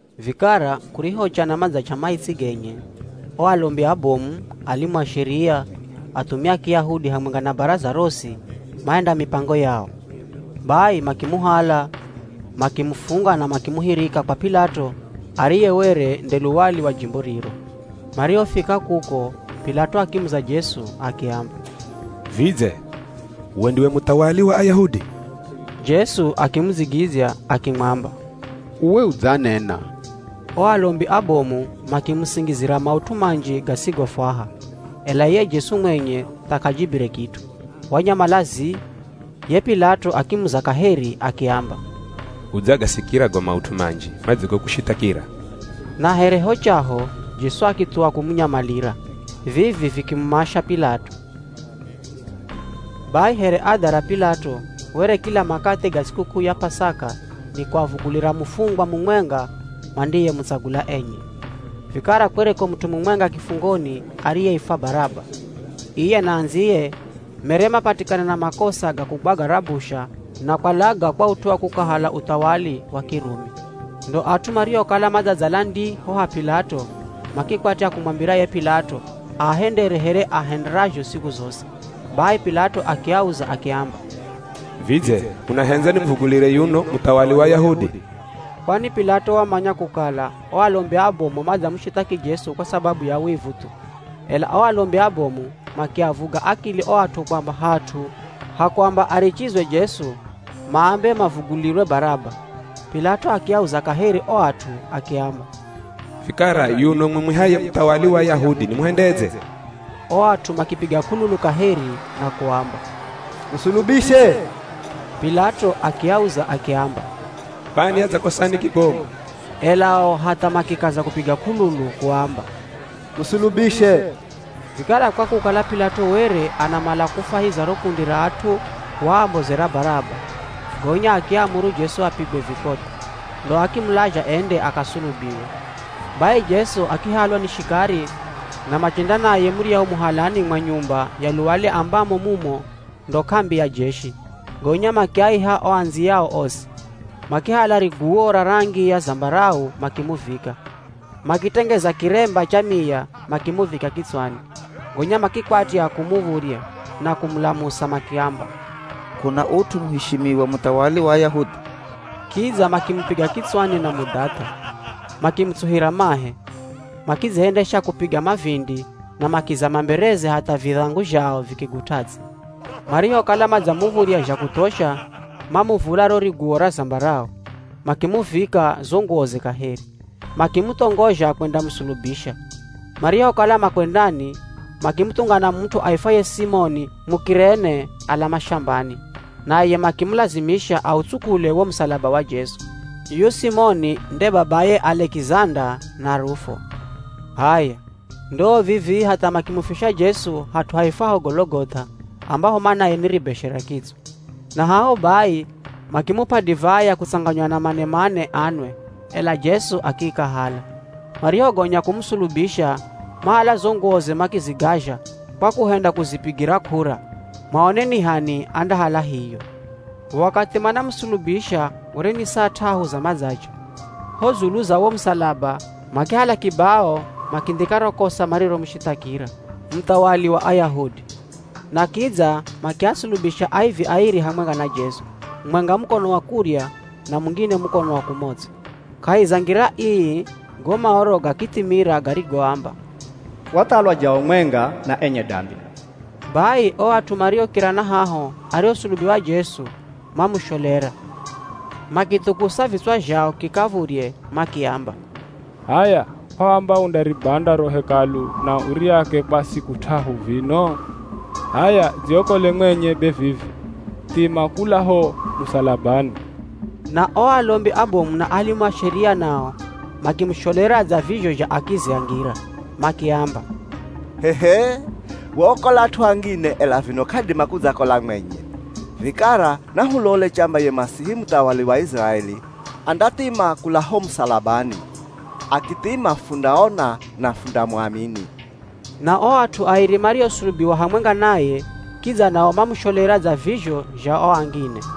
Vikara kurihocha na madzach'a maitsi genye, o alombi abomu, alimu a Sheria, athumia a Kiyahudi hamwenga na baraza rosi, mahenda mipango yao. Bai makimuhala, makimufunga na makimuhirika kwa P'ilato ariye were nde luwali wa jimbo riro. Marihofika kuko P'ilato akimuza Jesu akiamba, “Vidze we ndiwe muthawali wa Ayahudi?” Jesu akimudzigidzya akimwamba, “Uwe udzanena.” O alombi abomu makimusingizira maut'u manji gasigofwaha. Ela iye Jesu mwenye tha k'ajibire kit'u, wanyamala zii. Ye P'ilato akimuza kaheri akiamba, “Udzagasikira go maut'u manji madzigokushithakira?” Na here ho chaho Jesu akithuwa kumunyamalira. Vivi vikimumasha P'ilato. Bai here adha ra P'ilato were kila makathi ga sikuk'uu ya P'asaka ni kuavugulira mufungwa mumwenga mandiyemutsagula enye. Vikara kwereko mut'u mumwenga kifungoni ariyeifwa Baraba. Iye na andziye mere mapatikana na makosa ga kugwaga rabusha na kwalaga kwa ut'u wa kukahala uthawali wa Kirumi. Ndo at'u marihokala madzadzala ndii ho ha P'ilato, makikwatya kumwambira ye P'ilato aahendere here aahenderazho siku zosi. Bai P'ilato akiauza akiamba, “Vidze munahendza nimuvugulire yuno muthawali wa Ayahudi?” Kwani P'ilato wamanya kukala o alombi abomu madzamushithaki Jesu kwa sababu ya wivu thu. Ela o alombi abomu makiavuga akili o at'u kwamba hat'u ha kuamba arichizwe Jesu, maambe mavugulirwe Baraba. P'ilato akiauza kaheri o at'u akiamba, “Vikara yuno mumwihaye muthawali wa Ayahudi nimuhendedze?” O at'u makipiga k'ululu kaheri na kuamba, “Musulubishe!” P'ilato akiauza akiamba, “Kwani adzakosani kibomu?” Ela o hatha makikaza kupiga k'ululu kuamba, “Musulubishe!” Vikara kwa kukala P'ilato were anamala kufwahiza ro kundi ra at'u waambozera Baraba, gonya akiamuru Jesu apigwe vikotho, ndo akimulazha ende akasulubiwe. Bai Jesu akihalwa ni shikari na machenda naye muryahu muhalani mwa nyumba ya luwali ambamo mumo ndo k'ambi ya jeshi, gonya makiaiha o andziyao osi. Makihala riguwo ra rangi ya zambarau makimuvika, makitengeza kiremba cha miya makimuvika kitswani. Gonya makikwatya kumuv̱udhya na kumulamusa makiamba, “K'una ut'u muheshimiwa muthawali wa Ayahudi!” Kidza makimupiga kitswani na mudhath'a, makimutsuhira mahe, makidzihendesha kupiga mavindi na makizama mbereze hatha vidhangu zhao vikigut'a ts'i. Marihokala madzamuv̱udhya zha kuthosha, mamuvula ro riguwo ra zambarau, makimuvika zo nguwoze kaheri, makimuthongozha kwendamusulubisha. Marihokala makwendani, makimuthungana mut'u aifwaye Simoni Muk'irene ala mashambani, naye makimulazimisha autsukule wo musalaba wa Jesu. Yuyu Simoni nde babaye Alekizanda na Rufo. H'aya ndoo vivi hatha makimufisha Jesu hat'u haifwaho Gologoth'a, ambaho manaye ni Ribeshe ra Kitswa. Na haho bai makimup'a divai ya kutsanganywa na manemane anwe, ela Jesu akiikahala. Marihogonya kumusulubisha, mahala zo nguwoze makizigazha kwa kuhenda kuzipigira k'ura maone ni h'ani andahala hiyo. Wakathi manamusulubisha were ni saa t'ahu za madzach'a. Ho dzulu za wo musalaba makihala kibao makindhika ro kosa mariromushithakira: Muthawali Wa Ayahudi. Na kidza makiasulubisha aivi airi hamwenga na Jesu, mumwenga mukono wa kurya, na mungine mukono wa kumots'o. [ Kahi za ngira ii go Maoro gakithimira garigoamba, “Wathalwa jao mwenga na enye dambi.”] Bai o at'u mariokira na haho arihosulubiwa Jesu, mamusholera, makithukusa vitswa zhao kikav̱udhye, makiamba, “H'aya, kw'aamba undaribanda ro Hekalu na uriake kwa siku t'ahu vino? H'aya dziokole mwenye be vivi. Thima kula ho musalabani.” Na o alombi abomu na alimu a Sheria nao makimusholera dza vizho zha akizi a ngira. Makiamba, “Waokola at'u angine, ela vino k'adima kudzakola mwenye. Vikara nahulole chamba ye Masihi muthawali wa Iziraeli, andathima kula ho musalabani. Akithima fundaona na fundamuamini.” Na o at'u airi mariosulubiwa hamwenga naye kidza nao mamusholera dza vizho zha o angine.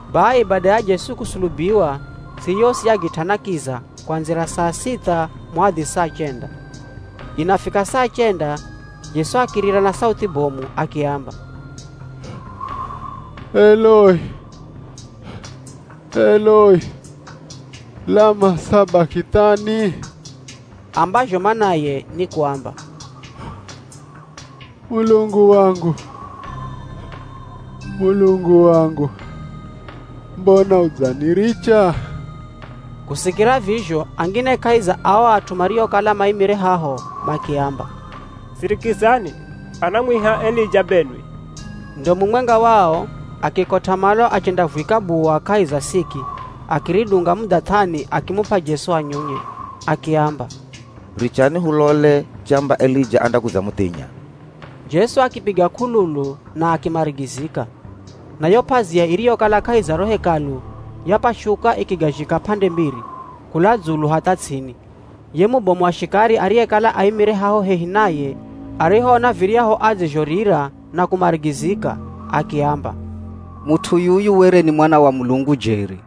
Bai bada ya Jesu kusulubiwa, ts'i yosi yagit'ana kiza kuandzira saa sitha muhadhi saa chenda. Inafika saa chenda, Jesu akirira na sauthi bomu akiamba, “Eloi Eloi, lama sabakithani?” Ambazho manaye ni kuamba, “Mulungu wangu, Mulungu wangu, mbona udzaniricha?” Kusikira vizho angine kahi za ao at'u mariokala maimire haho makiamba, “Sirikizani, anamwiha Elija benwi!” Ndo mumwenga wao akikot'a malo achendavwika buwa kahi za siki, akiridunga mudhath'ani akimup'a Jesu anyunye. Akiamba, “Richani hulole chamba Elija andakudzamuthinya.” Jesu akipiga k'ululu na akimarigizika. Na yo p'azia iriyokala kahi za ro Hekalu yapashuka ikigazhika p'ande mbiri, kula dzulu hatha ts'ini. Ye mubomu wa shikari ariyekala aimire haho hehi naye, arihoona viryahu adzizhorira na kumarigizika akiamba, “Mut'u yuyu were ni Mwana wa Mulungu jeri.”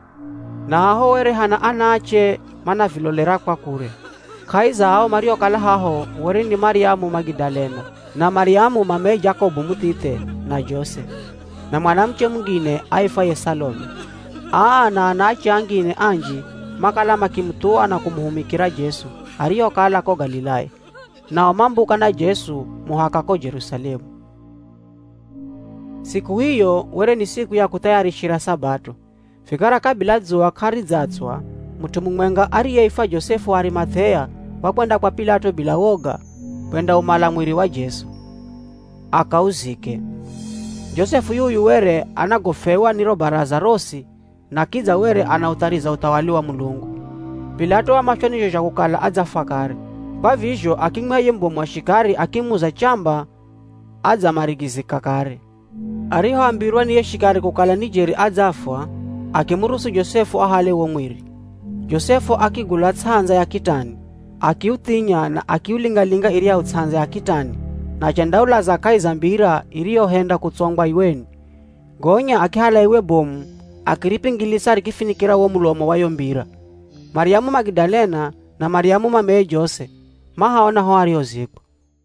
Na haho were hana anaache manavilolera kwa kure. Kahi za ao mariokala haho were ni Maryamu Magidalena, na Maryamu mameye Jakobu muthithe na Jose, na mwanamuche mungine aifwaye Salome. Aa na anaache angine anji makala makimuthuwa na kumuhumikira Jesu arihokala ko Galilaya, nao mambuka na Jesu muhaka ko Jerusalemu. Siku iyo were ni siku ya kuthayarishira Sabato. Vikara kabila dzuwa k'aridzatswa, mut'u mumwenga ariyeifwa Josefu wa Arimath'ea wakwenda kwa P'ilato bila woga kwendaumala mwiri wa Jesu, akauzike. Josefu yuyu were anagofwewa ni ro Baraza rosi na kidza were anauthariza uthawali wa Mulungu. P'ilato wamashwa ni zho zha kukala adzafwa kare. Kwa vizho akimwiha ye mubomu wa shikari akimuza chamba adzamarigizika kare. Arihoambirwa ni ye shikari kukala ni jeri adzafwa, akimuruhusu Josefu ahale wo mwiri. Josefu akigula ts'andza ya kitani, akiuthinya na akiulinga-linga iryahu ts'andza ya kitani na achendaulaza kahi za mbira iriyohenda kutsongwa iweni. Gonya akihala iwe bomu akiripingilisa rikifinikira wo mulomo wa yo mbira. Maryamu Magidalena na Maryamu mameye Jose mahaona ho arihozikwa.